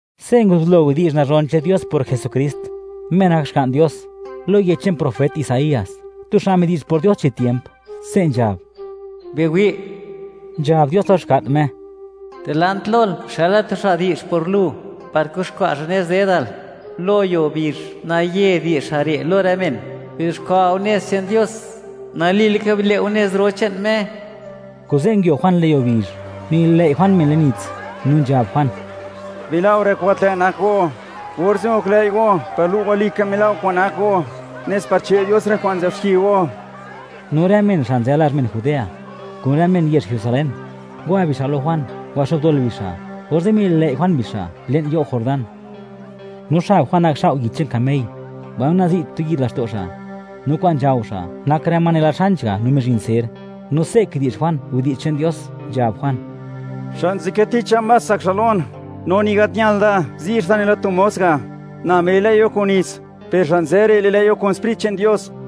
Se' nguzublo widi'zh nazhon che'n Dios por Jesukrist, Me nak Xga'n Dios. Lo yech che'n profet Isaías, tu xa' midi'zh por Dios chi tiemp, se' nzhab: Biwi', nzhab Dios lo Xga'n Me, dilant lol xëla tu xa' di'zh por Lu, par kuxkwa' xa' nez dedal. Lo yuo bizh, naye di'zh xa' re' lo rë men: “Bizuxkwa' go nez che'n Dios, nali laka bile' go nez ro che'n Me.” Kuze' nguio Juan le'n yuo bizh, nililëi' Juan men le'n nits, nu nzhab Juan: ―Bila' go rë kwa'n gat lë' nak go, orze' goklëi' go par lu' go, walika mila' go kwa'n nak go, nes par che' Dios rë kwa'n nzë'b xki go. No rë men xa' nzë lazh men Judea, kun rë men yezh Jerusalén, ngwa bixa' lo Juan, ngwaxo'bdol bixa', orze' mililëi' Juan bixa' le'n you' Jordán. No xab Juan nakxao' yich che'n kamey, mbaino nazi' tu yid laxto' xa'; no kwa'n nzhao xa' nak rë ma nela xanch ga' no mizhin ser. No se' kidi'zh Juan widi'zh che'n Dios, nzhab Juan: ―Xa' nzadkë ticha más tsak xa' lon; no ni gat ñal da, zi' xa' da nela tu mos ga'. Na mililëi' go kun nits, per xa' nzë re' li'lëi' go kun Sprit che'n Dios.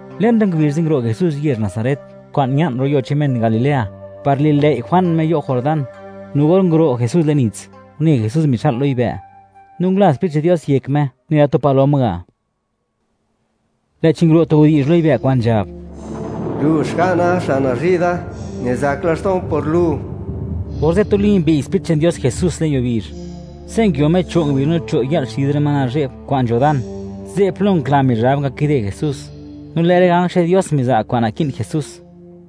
Le'n rë ngubizh ze' nguro' Jesús yezh Nazaret, kwa'n ña'n lo yuo che'n men Galilea, par li'lëi' Juan Me you' Jordán, no or nguro' Jesús le'n nits, une Jesús mixa'l lo yibë', no ngula Sprit che'n Dios yek Me nela tu palom ga'. Lë'chi nguro' tu widi'zh lo yibë' kwa'n nzhab: ―Lu Xga'na xa' nazhi' da; nizak laxto'n por Lu. Orze' tuli mbi'y Sprit che'n Dios Jesús le'n yuo bizh. Ze' nguio Me cho' ngubizh no cho' yë'l xid rë ma nazhe'b kwa'n nzho dan; ze' plo ngokla Mizhab ngakide Jesús, no lë' rë ganj che'n Dios miza' kwa'n naki'n Jesús.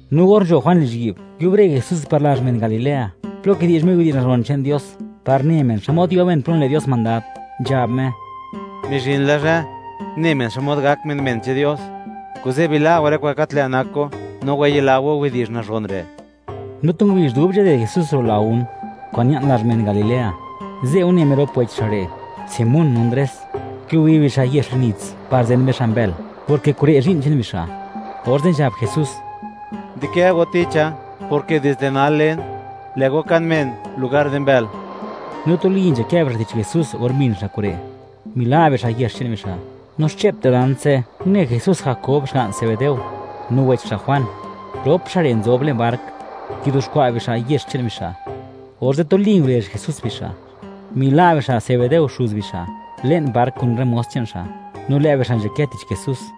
No or nzho Juan lizhyi'b, nguiubre Jesús par lazh men Galilea, plo kidi'zh Me widi'zh nazhon che'n Dios par ne men xmod yo men plo nile' Dios mandad, nzhab Me: ―Mizhin la zhë ne men xmod gak men, men che'n Dios; kuze' bila' go rë kwa'n gat lë' nak go, no wayila go widi'zh nazhon re'. No tu ngubizh dub nzhaded Jesús ro' lagún kwa'n ña'n lazh men Galilea, ze' une Me rop wech xa' re', Simón no Ndres; kigubi bixa' yex le'n nits par zen bixa' mbël, porke kure' zhi'n che'n bixa', orze' nzhab Jesús: ―Di'kë go ticha, porke dizde nal, len, lë' go kan men lugar di mbël. No tuli nzhakë bixa' tich Jesús or mbin bixa' kure', mila' bixa' yex che'n bixa'. No xche'p dilant ze' une Jesús Jakob xga'n Zebedeo, no wech xa' Juan, rop xa' re' nzob le'n bark, kizuxkwa' bixa' yex che'n bixa', orze' tuli ngurezh Jesús bixa', mila' bixa' Zebedeo xuz bixa' le'n bark kun rë mos che'n xa', no lë' bixa' nzhakë tich Jesús.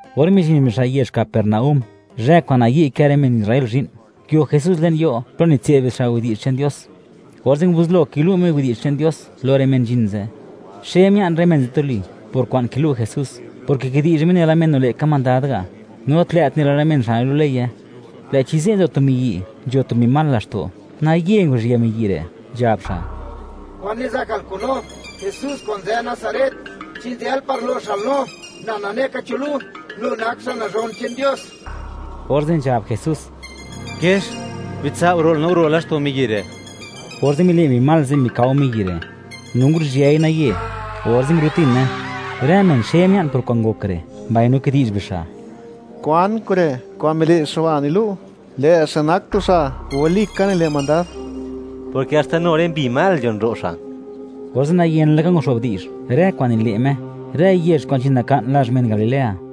Or mizhin bixa' yezh Capernaúm, zhë kwa'n nayi' kë rë men Israel zhi'n, nguio Jesús le'n yo' plo nitse'd bixa' widi'zh che'n Dios, orze' nguzublo kilu' Me widi'zh che'n Dios lo rë men nzhin ze'. Xe mia'n rë men ze' tuli por kwa'n kilu' Jesús, porke kidi'zh Me nela men nile' ka mandad ga', no tlë't nela rë men xa' nilu' leye. Lë'chi ze' nzo tu miyi', nzho tu mbi mal laxto', naye nguru'zhië miyi' re', nzhab xa': ―¿Kwan nizakal kun no, Jesús kwa'n nzë Nazaret? ¿Chi nzël par lo'xal no? ¡Na nane ka cho lu, Lu nak xa' Nazhon che'n Dios! Orze' nzhab Jesús: ―¡Kiex, bitsao' ro'l, no guro' laxto' miyi' re'! Orze' mile' mbi mal ze' mikao miyi' re', no nguru'zhyëi naye, orze' nguro'tine. Rë men xe mia'n por kwa'n ngok re', mbaino kidi'zh bixa': ―¿Kwan kure'? Kwa'n mile' xa' ba' nilu', lë' xa' nak tu xa' walika nile' mandad, porke, ¡haxta nu rë mbi mal nzhon ro' xa'! Orze' nayen laka nguxo'b di'zh, rë kwa'n nile' Me, rë yezh kwa'n nzhin naka'n lazh men Galilea.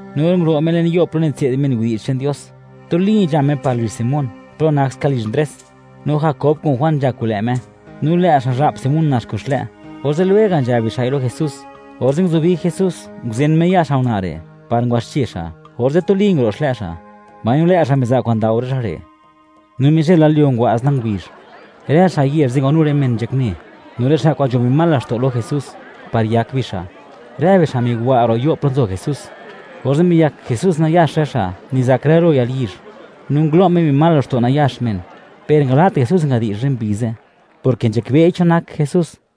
No or nguro' Me le'n yo' plo nitse'd men widi'zh che'n Dios, tuli nzha Me par lizh Simón plo nak ska lizh Ndres, no Jakob kun Juan nzha kun lë' Me. No lë' xa'zha'p Simón nax kun xlë', orze' lwega' nzhab bixa'i lo Jesús. Orze' nguzubi Jesús, nguzen Me ya' xa' una' re' par ngwaxche xa', orze' tuli nguro' xlë' xa', mbaino lë' xa' miza' kwa'n ndao rë xa' re'. No mizhël la lyuo ngwa'z la ngubizh, rë xa' yezh ze' ngwanu rë men nzhakne, no rë xa' kwa'n nzho mbi mal laxto' lo Jesús par yak bixa'. Rë bixa' migwa' ro' yo' plo nzo Jesús, orze' miliyak Jesús nayax rë xa' nizak rë lo yalyizh, no ngulo' Me mbi mal laxto' nayax men, per nangala't Jesús ngadi'zh rë mbi ze', porke nzhakbe'i cho nak Jesús.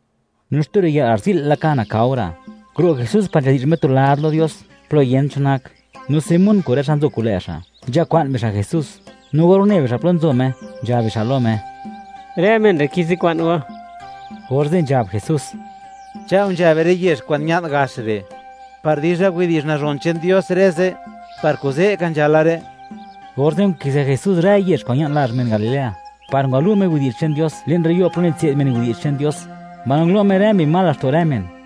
No xtu riyë'l, garzi'l laka, nakao ra'; nguro' Jesús par nzhadi'zh Me tu lad lo Dios plo yent cho nak. No Simón kun rë xa' nzo kun lë' xa', nzhakwa'n bixa' Jesús, no or une bixa' plo nzo Me, nzhab bixa' lo Me: ―Rë men re' kizikwa'n go. Orze' nzhab Jesús: ―Cha'o nzha be rë yezh kwa'n ña'n gax re', par dizha widi'zh nazhon che'n Dios rë ze'; par kuze' ka nzhala re'. Orze' nkizë Jesús rë yezh kwa'n ña'n lazh men Galilea, par ngwalu' Me widi'zh che'n Dios le'n rë yo' plo nitse'd men widi'zh che'n Dios, mbaino ngulo' Me rë mbi mal laxto' rë men.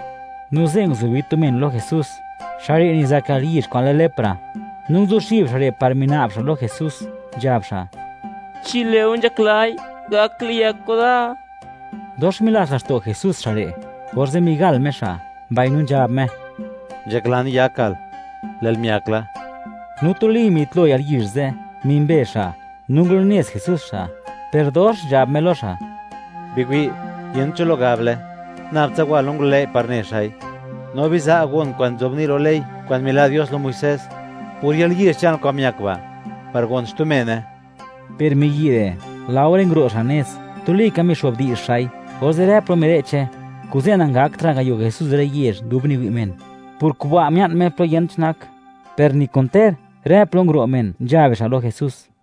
No ze' nguzubi tu men lo Jesús, xa' re' nizak yalyizh kwa'n lë lepra, no nguzuxib xa' re' par mina'b xa' lo Jesús, nzhab xa': ―Chi lë'o nzhaklai, gak liyak go da. Dox milats laxto' Jesús xa' re', orze' migal Me xa', mbaino nzhab Me: ―Nzhaklan yakal; lë'l miakla. No tuli mitlo yalyizh ze', mimbe xa'. No ngulunez Jesús xa', per dox nzhab Me lo xa': ―Biwi', yent cho lo gable, nab tsa wa lo ngulëi' par ne xa'i, no biza' gon kwa'n nzobni' lo ley kwa'n mila' Dios lo Muisés por yalyizh che'nal kwa'n miak ba', par gon xtu mene. Per miyi' re', laore nguro' xa' nez, tuli ka mixo'bdi'zh xa'i, orze' rë plo mire'che, kuze' nangaktra' ngayo Jesús rë yezh dub niwi' men. Por kuba' mia'n Me plo yent cho nak, per ni kun ter, rë plo nguro' men, nzha bixa' lo Jesús.